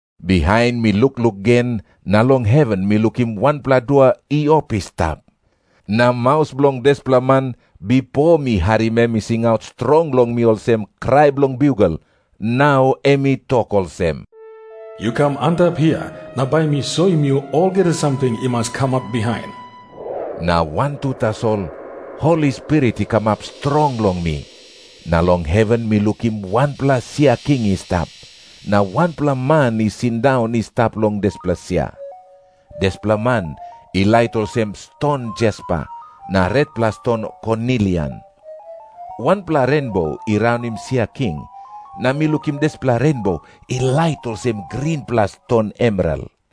Bihain mi lukluk gen na long heven mi lukim wanpela dua i op I stap. Na maus bilong dispela man, bipo mi harim em i singaut strong long mi olsem krai bilong biugel, nau em i tok olsem, "Yu kam antap hia, na bai mi soim yu olgeta samting i mas kamap bihain." Na wantu tasol Holi Spirit i kamap strong long mi, na long heven mi lukim wanpela sia king i stap, na wanpela Man i sindaun i stap long dispela sia. Dispela Man i lait olsem ston jaspa na retpela ston konilian. Wanpela renbo i raunim sia king, na mi lukim dispela renbo i lait olsem grinpela ston emeral.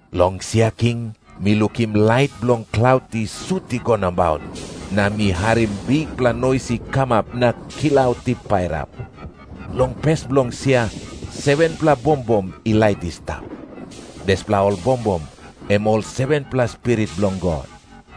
Long sia king mi lukim lait bilong klaut i sut i go nabaut, na mi harim bikpela nois i kamap na klaut i pairap. Long pes bilong sia 7-pela bombom i lait i stap. Dispela ol bombom em ol 7-pela spirit bilong God.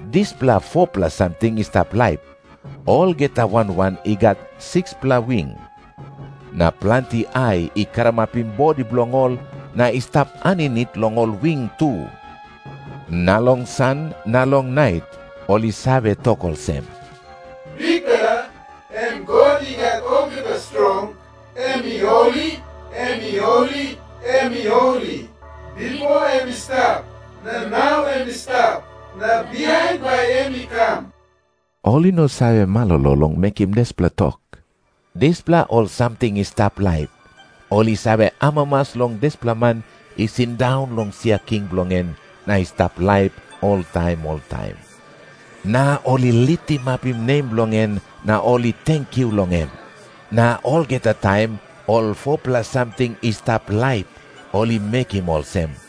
Dispela 4-pela samting i stap laip, olgeta wan wan i gat 6-pela wing. Na planti ai i karamapim bodi bilong ol, na i stap aninit long ol wing tu. Na long san na long nait ol i save tok olsem, "Bikpela, em God I Gat Olgeta Strong, em i holi, em i holi, em i holi. Bipo em i stap, na nau em i stap, na bihain bai em i kam." Ol i no save malolo long mekim dispela tok. Dispela ol samting i stap laip, ol i save amamas long dispela Man i sindaun long sia king bilong en na i stap laip oltaim oltaim. Na ol i litimapim nem bilong en na ol i tenkyu long em. Na olgeta taim ol 4-pela samting i stap laip ol i mekim olsem,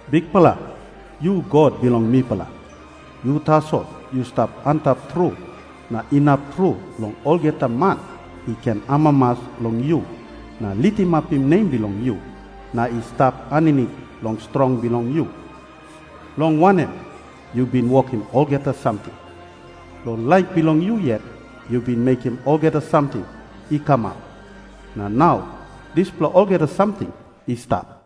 "Bikpela, yu God bilong mipela. Yu tasol yu stap antap tru na inap tru long olgeta man i ken amamas long yu na litimapim nem bilong yu na i stap aninit long strong bilong yu. Long wanem, yu bin wokim olgeta samting. Long laik bilong yu yet yu bin mekim olgeta samting i kamap, na nau dispela olgeta samting i stap."